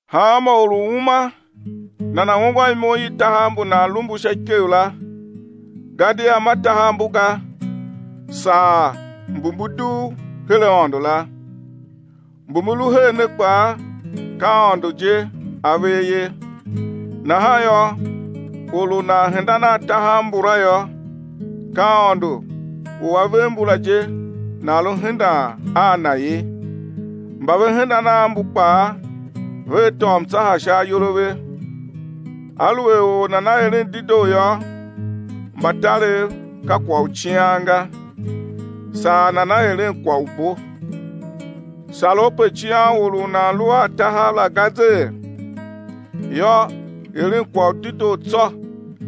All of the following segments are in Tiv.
Hanma or u uma nana̱ ungwan imo i tahav mbu nan lu mbu sha ikev la, gadia ma tahav mbu ga, saa mbu mbu dugh her Aôndo la, mbu mbu lu her ne kpaa, ka Aôndo je A ver ye. Nahan yô, or u nan hendan a tahav mbula yô, ka Aôndo u A ver mbu la je nan lu hendan a Na ye. Mba ve hendan a mbu kpaa vea tôô mtsaha sha ayol a ve. Aluer or nana eren dedoo yô, mbatarev ka kwagh u cian ga, saa nana eren kwagh u bo. Sar u pe cian or u nan lu a tahav la ga zee? Yô, eren kwagh u dedoo tsô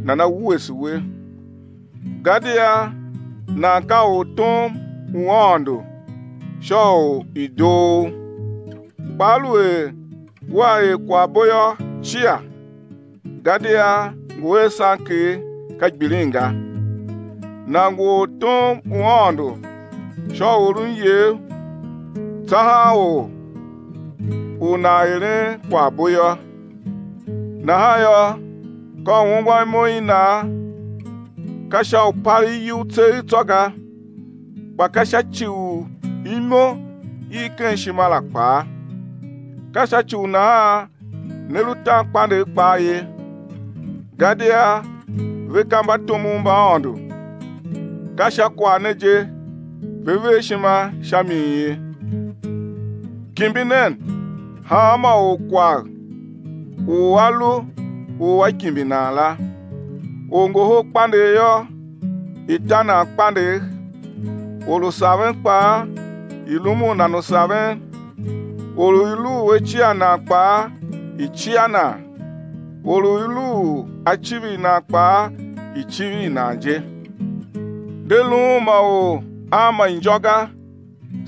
nana wuese we. Gadia nan ka ortom u Aôndo sha u i̱ doo u. Kpa aluer wea er kwaghbo yô, cia, gadia ngu a sanker, ka gbilin ga. Nan ngu ortom u Aôndo sha u oron iyev tsahan or u nan eren kwaghbo yô. Nahan yô, ka u ungwan imo i nan, ka sha u palegh iyugh tseegh tsô ga, kpa ka sha ci u imo i ken ishima la kpaa. Ka sha ci u nahan ne lu tan kpandegh kpaa ye, gadia ve ka mbatomov mba Aôndo, ka sha kwagh ne je ve ver ishima sha mi ye. Kimbi nen hanma or kwagh u a lu u á kimbi nan la, orngohol kpandegh yô, i̱ ta nan kpandegh, or u saven kpaa i̱ rumun nan u saven, or u i lu u á cia nan kpaa, i̱ cia nan, or u i lu u á civir nan kpaa i̱ civir nan je. De luun ma or a ma injô ga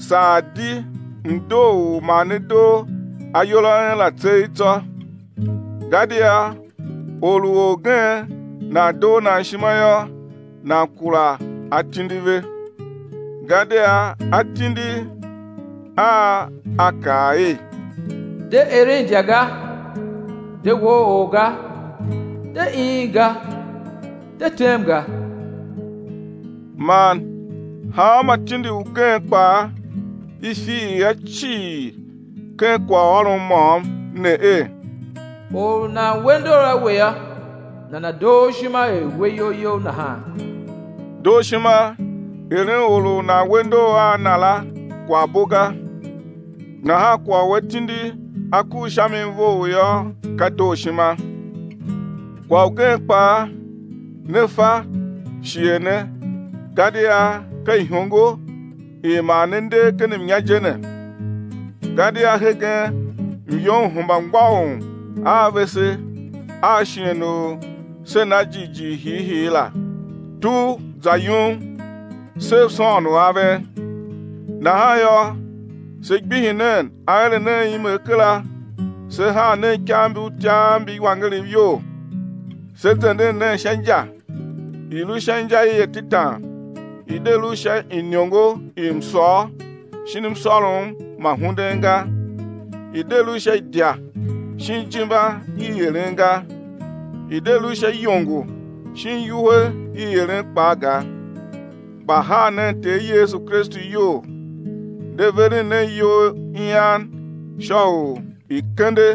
saa di mdoo u ma ne doo ayol a en la tseegh tsô, gadia or u orgen nan doo nan ishima yô, nan kura atindi ve. Gadia atindi a a kaa er: De eren idya ga, de woo or ga, de iin ga, de tem ga, man hanma tindi ugen kpaa i fiir a cii ken kwaghôron môm ne er, or u nan we ndor a we yô, nana̱ doo u ishima er we iyol you nahan. Dooshima eren or u nan we ndor a na la, kwaghbo ga, nahan kwagh u atindi a kur sha mi vough yô, ka dooshima. Kwagh ugen kpaa, ne fa shighe ne gadia ka ihongo i ma ne nder ken mnya je ne, gadia hegen myom hemba mgbôghom a vese a shighe u se na jighjigh hiihii la. Tugh za yum, sev sôôn aven. Nahan yô, se gbihi nen aeren a imegh kera se haa nen ikav mbi utyav mbi iwangerev iyol. Se zenden nen sha inja, i̱ lu sha inja i atetan, i̱ de lu sha iniongo i msôr shin msôrom ma hunden ga, i̱ de lu sha idya shin ijimba i eren ga, i̱ de lu sha iyongo shin iwuhe i eren kpaa ga. Kpa haa nen Ter Yesu Kristu iyol, de veren nen iyol ian sha u i̱ kende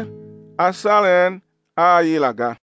asaren a i la ga.